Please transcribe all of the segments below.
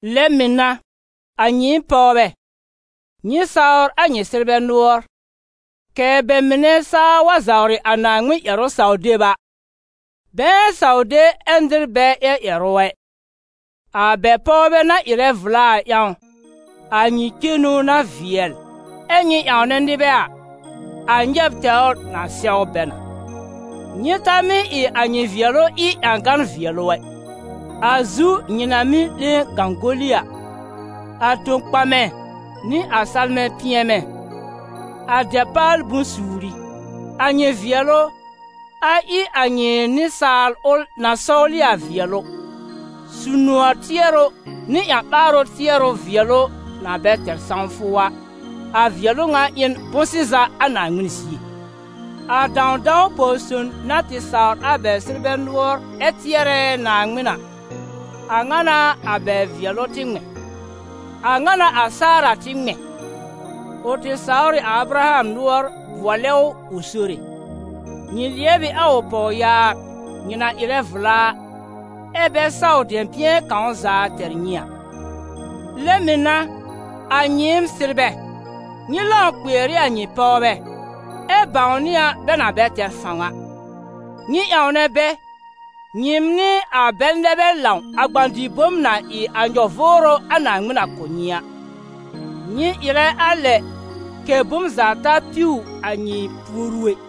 Lɛ mɩ̀ n'a, a nyɩɩm pɔwbɛ, nyɩ sawr a nyɩ sɩrbɛ nʋɔr, kɛ̀ bɛ mɩnɛ saa wa zawrɩ a Naaŋmɩn ƴɛrʋ saw deb a, bɛ̃ɛ saw de ɛ́ nɩr bɛ ƴɛr ƴɛrʋ ɛ, a bɛ pɔwbɛ na ɩrɛ vla a ƴãw, a nyɩ cenu na vɩɛl ɛ nyɩ ƴãwnɛ nɩbɛ a, a nyɛb tɛwr na sɛw bɛ na. Nyɩ ta mɩ́ ɩ a nyɩ vɩɛlʋ ɩ ƴãgan vɩɛlʋ ɛ: a zu nyɩ na mɩ́ 'lẽ gãgoli a, a tokpamɛ nɩ a salmɛ̃ pɩɛmɛ, a dɛpaal bʋ̃-suuri. A nyɩ vɩɛlʋ, a ɩ a nyɩ nɩsaal ʋl na sɔwlɩ a vɩɛlʋ, su-nʋ̃ɔ̀ tɩɛrʋ nɩ ƴã-ɓaarʋ tɩɛrʋ vɩɛlʋ na bɛ tɛr sãwfʋ a, a vɩɛlʋ ŋa ɩ n bʋ̃-sɩza a Naaŋmɩn zie. A dãwdãw pɔw-son na tɩ sawr a bɛ sɩrbɛ nʋɔr ɛ tɩɛrɛ Naaŋmɩn a, a ŋa n'a a bɛ vɩɛlʋ tɩ ŋmɛ̃. A ŋa n'a a Saara tɩ ŋmɛ̃: ʋ tɩ sawr ɩ a Abraham nʋɔr, bʋɔlɛ ʋ ʋ sore. Nyɩ lɩɛb ɩ a ʋ pɔwyaar, nyɩ na ɩrɛ vla a, ɛ bɛ saw dɛ̃bɩ̃ɛ kãw za tɛr nyɩ a. Lɛ mɩ̀ n'a, a nyɩɩm sɩrbɛ, nyɩ lãw kpɩɛr ɩ a nyɩ pɔwbɛ, ɛ bãwnɩ a bɛ na bɛ tɛr fãw a. Nyɩ ƴãwnɛ bɛ, nyɩɩm nɩ a bɛl nɛ bɛ lãw a gbã-dɩ-bom na ɩ a nyɔ-vʋʋrʋ a Naaŋmɩn na kʋ̀ nyɩ a. Nyɩ ɩrɛ a lɛ kɛ̀ bom za ta piw a nyɩ puoru ɛ.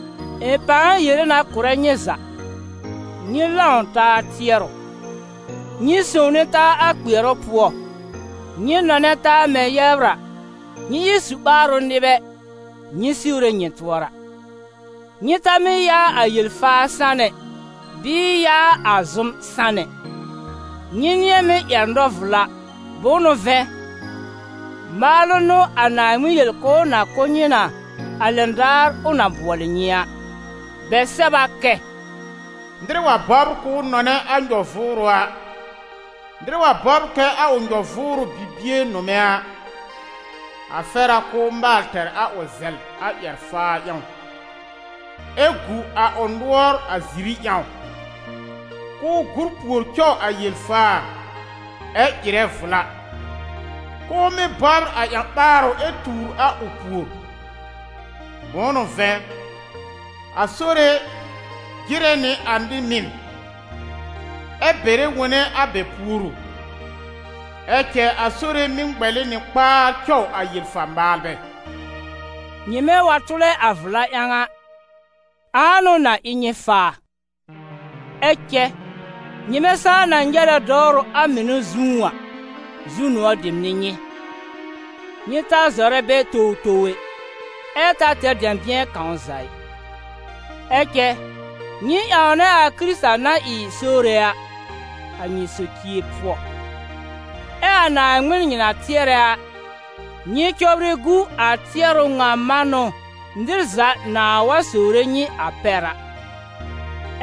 Ɩ̃ pãa yere na kʋrɛ nyɩ za, nyɩ lãw taa tɩɛrʋ: nyɩ sõwne taa a kpɩɛrʋ pʋɔ, nyɩ nɔnɛ taa mɛ̃ yɛbr a, nyɩ ɩ su-ɓaarʋ nɩbɛ, nyɩ siwre nyɩ tʋɔra. Nyɩ ta mɩ́ yaa a yel-faa san ɛ, bɩɩ yaa a zʋm san ɛ. Nyɩ nɩ̃ɛ mɩ́ ƴɛr nɔ-vla, bʋ̃ʋ n'ʋ vɛ̃, maalʋ n'ʋ a Naaŋmɩn yel k'ʋʋ na kʋ̀ nyɩ na, a lɛn daar ʋ na bʋɔlɩ nyɩ a. Bɛ sɛb a kɛ: «Nɩr wa bɔbr k'ʋʋ nɔnɛ a nyɔ-vʋʋrʋ a, nɩr wa bɔbr kɛ a ʋ nyɔ-vʋʋrʋ bibie nʋmɛ a, a fɛr a k'ʋʋ maal tɛr a ʋ zɛl a ƴɛr-faa ƴãw, ɛ gu a ʋ nʋɔr a ziri ƴãw; k'ʋʋ gur pùor cɔw a yel-faa ɛ ɩrɛ a vla, k'ʋʋ mɩ́ bɔbr a ƴã-ɓaarʋ ɛ tuur a ʋ pùor.» Bʋ̃ʋ n'ʋ vɛ̃, «A Sore jɩrɛ nɩ a nɩ-mɩn, ɛ bɛrɛ wone a bɛ puoru; ɛ cɛ a Sore mɩ́ ŋmɛlɩ nɩ kpaar cɔw a yel-fa-maalbɛ.» Nyɩmɛ wa tʋlɛ a vla ƴãw a, ãa n'ʋ na ɩ nyɩ faa? Ɛ cɛ nyɩmɛ saa na nyɛrɛ dɔwrʋ a mɩnʋ zũú a, zu-nʋ̃ɔ̀ dem n'ɩ nyɩ. Nyɩ ta zɔrɛ bɛ towtow ɛ, ɛ ta tɛr dɛ̃bɩ̃ɛ kãw za ɩ. Ɛ cɛ nyɩ ƴãwnɛ a Kɩrɩta na ɩ Sore a, a nyɩ socie pʋɔ. Ɛ a Naaŋmɩn nyɩ na tɩɛrɛ a, nyɩ cɔbrɩ gu a tɩɛrʋ ŋa manʋ nɩr za nãà wa sowre nyɩ a pɛr a.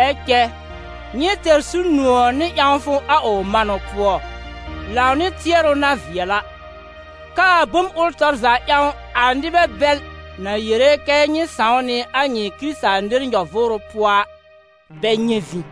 Ɛ cɛ nyɩ tɛr su-nʋ̃ɔ̀ nɩ ƴãwfʋ a ʋ manʋ pʋɔ, lãw nɩ tɩɛrʋ na vɩɛl a, k'aa bom ʋl tɔr za ƴãw a nɩbɛ bɛl, na yere kɛ́ nyɩ sãw nɩ a nyɩ Kɩrɩta-nɩr nyɔ-vʋʋrʋ pʋɔ a, bɛ nyɛ̃ vĩ.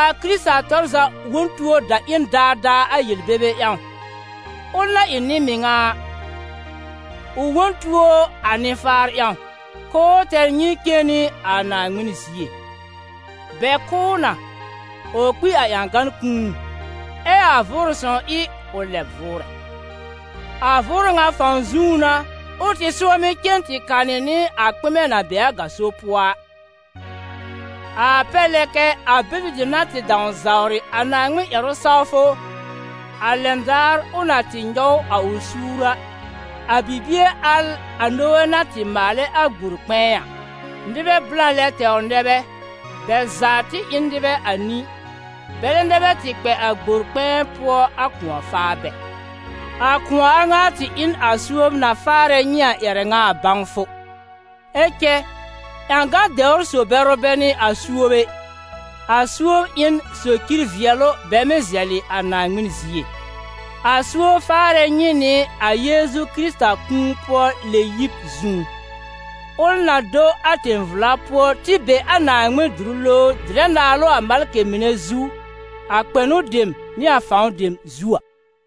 A Kɩrɩta tɔr za wõ n tuo daƴẽn daadaa a yel-bebe ƴãw, ʋl na ɩ nɩ-mɩŋa a; ʋ wõ n tuo a nɩ-faar ƴãw, k'ʋʋ tɛr nyɩ cen nɩ a Naaŋmɩn zie. Bɛ kʋ́ ʋ na, ʋ kpi a ƴãgan kũu, ɛ a Vʋʋrʋ Sõw ɩ ʋ lɛb vʋʋrɛ. A Vʋʋrʋ ŋa fãw zũú n'a ʋ tɩ sʋ̃ɔmɩ cen tɩ kanɩ nɩ a kpɩ̃mɛ na be a gaso pʋɔ a, a pɛr lɛ kɛ a bɛlɩ dem na tɩ dãw zawrɩ a Naaŋmɩn ƴɛrʋ sawfʋ a lɛn daar ʋ na tɩ nyɔw a ʋ suur a, a bibie al a Nowe na tɩ maalɛ a gbor-kpɛ̃ɛ a. Nɩbɛ blã le lɛ tɛwr nɛ bɛ, bɛ za tɩ ɩ n nɩbɛ anĩ, bɛlɛ nɛ bɛ tɩ kpɛ a gbor-kpɛ̃ɛ pʋɔ a kʋ̃ɔ fáa bɛ. A kʋ̃ɔ a ŋa tɩ ɩ n a suob na faarɛ nyɩ a ƴɛrɛ ŋa a bãwfʋ: ɛ cɛ ƴãgan dɛwr so-bɛrʋ bɛ n'ɩ a suob ɛ, a suob ɩ n socir vɩɛlʋ bɛ mɩ́ zɛlɩ a Naaŋmɩn zie. A suob faarɛ nyɩ nɩ a Yeezu Kɩrɩta kũu-pʋɔ-lɛ-yib zũú, ʋl na do a tẽ-vla pʋɔ tɩ be a Naaŋmɩn dʋrʋ lowr dɩrɛ naalʋ a malkɩ mɩnɛ zu, a kpɛnʋ dem nɩ a fãw dem zu a.